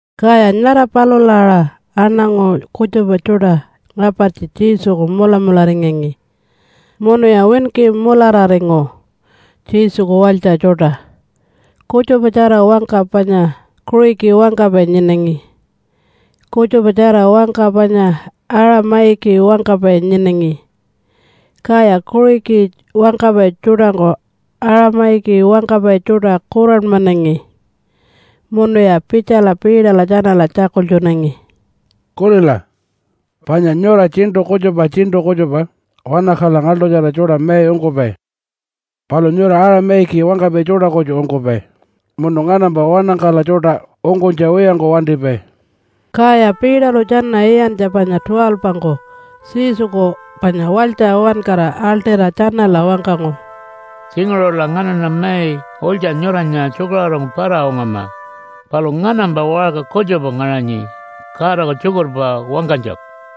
Kaya nyara palula aṟa aṉangu kutjupa tjuṯa ngapartji Jesuku mulamularingangi munuya winki mulararingu Jesuku walytja tjuṯa, kutjupatjara wangka panya Kuṟiki wangkapai nyinangi, kutjupatjara wangka panya Aṟa-mayiki wangkapai nyinangi. Kaya Kuṟiki wangkapai tjuṯangku Aṟa-mayiki wangkapai tjuṯa kuranmanangi, munuya pitjala Peterla tjanala tjakultjunangi, “Kulila! Panya nyura tjiṉṯu kutjupa tjiṉṯu kutjupa wanakaḻa ngaḻṯutjara tjuṯa mai ungkupai. Palu nyura Aṟa-mayiki wangkapai tjuṯa kutju ungkupai munu nganampa wanakaḻa tjuṯa ungkunytja wiyangku wantipai.” Kaya Peterlu tjana iyantja panya 12-ngku Jesuku panya walytja uwankara aḻṯira tjanala wangkangu, “Tjinguṟula nganaṉa mai ulytja nyuranya tjukaṟurungku para-ungama. Palu nganampa waṟka kutjupa ngaṟanyi Godaku tjukurpa wangkanytjaku.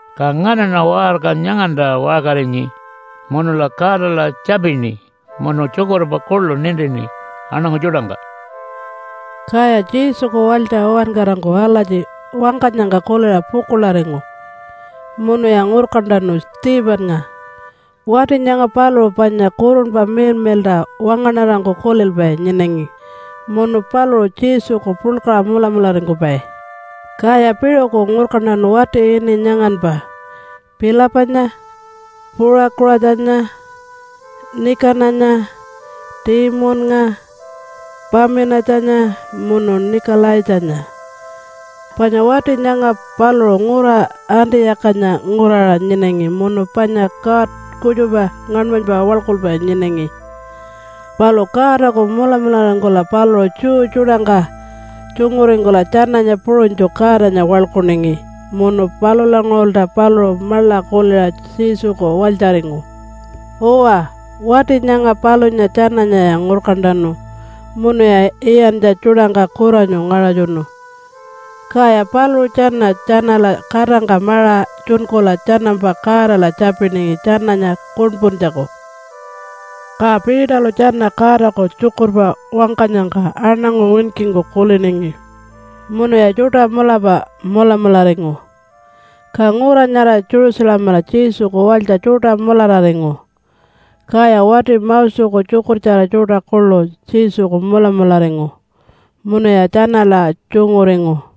Ka nganaṉa waṟka nyanganta waṟkarinyi munula Godala tjapini munu tjukurpa kuḻu nintini aṉangu tjuṯangka.” Kaya Jesuku walytja uwankarangku alatji wangkanyangka kuliṟa pukuḻaringu munuya ngurkantanu Stephennga. Wati nyanga paluṟu panya Kurunpa Miḻmiḻṯa wangaṉarangku kulilpai nyinangi munu paluṟu Jesuku puḻkaṟa mulamularingkupai. Kaya piṟuku ngurkantanu wati ini nyanganpa Philipanya, Puṟakuṟatjanya, Nikananya, Timunnga, Paminatjanya munu Nikalaitjanya, panya wati nyanga paluṟu ngura Antiyakanya nguraṟa nyinangi munu panya god kutjupa ngaṉmanypa waḻkulpai nyinangi, palu Godaku mulamularingkula paluṟu Jew tjuṯangka tjunguringkula tjananya puṟunytju Godanya waḻkuningi munu palulanguṟulta paluṟu maḻa kuliṟa Jesuku walytjaringu. Uwa, wati nyanga palunya tjananyaya ngurkantanu munuya Iyantja Tjuṯangka kuranyu ngaṟatjunu, kaya paluṟu tjana tjanala katangka maṟa tjunkula tjanampa Godala tjapiningi tjananya kuṉpuntjaku. Ka Peterlu tjana Godaku tjukurpa wangkanyangka aṉangu winkingku kuliningi. Munuya tjuṯa mulapa mulamularingu, ka ngura nyara Jerusalemala Jesuku walytja tjuṯa mulararingu, kaya wati Moseku tjukurtjara tjuṯa kuḻu Jesuku mulamularingu munuya tjanala tjunguringu.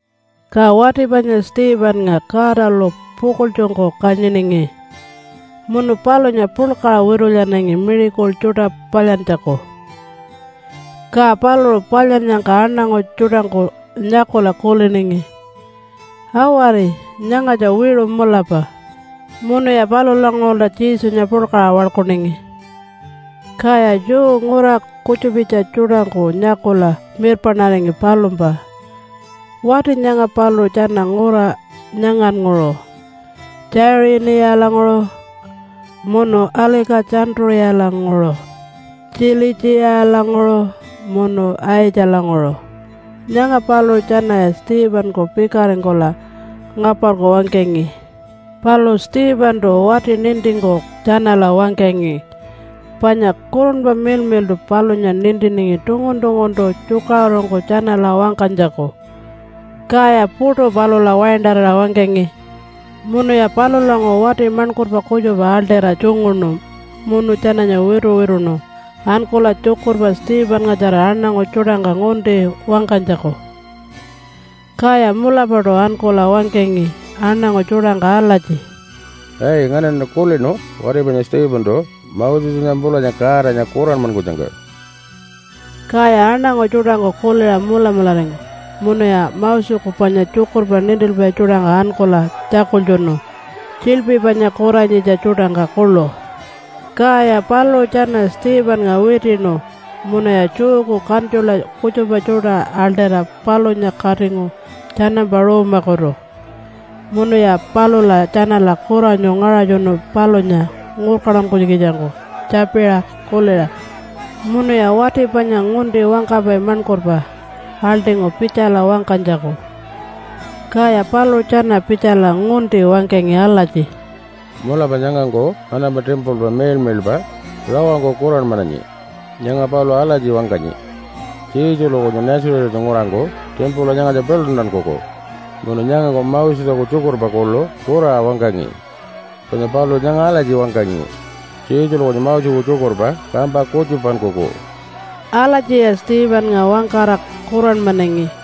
Ka wati panya Stephennga Godalu pukuḻtjungku kanyiningi, munu palunya puḻkaṟa witulyanangi miracle tjuṯa palyantjaku. Ka paluṟu palyannyangka aṉangu tjuṯangku nyakula kuliningi, “Awari! Nyangatja wiṟu mulapa!” Munuya palulanguṟulta Jesunya puḻkaṟa waḻkuningi. Kaya Jew ngura kutjupitja tjuṯangku nyakula mirpaṉaringi palumpa. Wati nyanga paluṟu tjana ngura nyangannguṟu Tjaiṟinilanguṟu munu Alika-tjantu-ṟiyalanguṟu, Tjilitjiyalanguṟu munu Aitjalanguṟu. Nyanga paluṟu tjanaya Stephenku pikaringkula ngaparku wangkangi. Palu Stephentu wati nintingku tjanala wangkangi, panya Kurunpa Miḻmiḻṯu palunya nintiningi tungun-tunguntu tjukaṟurungku tjanala wangkanytjaku, kaya puṯu palula waintarira wangkangi. Munuya palulanguṟu wati maṉkurpa kutjupa aḻṯira tjunguṉu munu tjananya wituwituṉu ankula tjukurpa Stephenngatjara aṉangu tjuṯangka ngunti wangkanytjaku. Kaya mulapaṯu ankula wangkangi aṉangu tjuṯangka alatji, “Ai! Nganaṉa kulinu wati panya Stephentu Mosenya pulanya Godanya kuranmankunyangka.” Kaya aṉangu tjuṯangku kuliṟa mulamularingu munuya Moseku panya tjukurpa nintilpai tjuṯangka ankula tjakultjunu, tjiḻpi panya kuranyitja tjuṯangka kuḻu. Kaya paluṟu tjana Stephennga witiṉu munuya Jewku kantjula kutjupa tjuṯa aḻṯira palunya katingu tjanampa ruumakutu munuya palula tjanala kuranyu ngaṟatjunu palunya ngurkantankunytjikitjangku tjapiṟa kuliṟa. Munuya wati panya ngunti wangkapai maṉkurpa aḻṯingu pitjala wangkanytjaku. Kaya paluṟu tjana pitjala ngunti wangkangi alatji, “Mulapa nyangangku nganampa timpula miḻmiḻpa rawangku kuranmananyi. Nyanga paluṟu alatji wangkanyi, Jesulu kunyu Nazarethanya nguraṟangku timpula nyangatja piḻuntankuku. Munu nyangangku Moseku tjukurpa kuḻu kuraṟa wangkangi, panya paluṟu nyanga alatji wangkangi, Jesulu kunyu Moseku tjukurpa kampa kutjupankuku.” Alatjiya Stephennga wangkara kuranmanangi.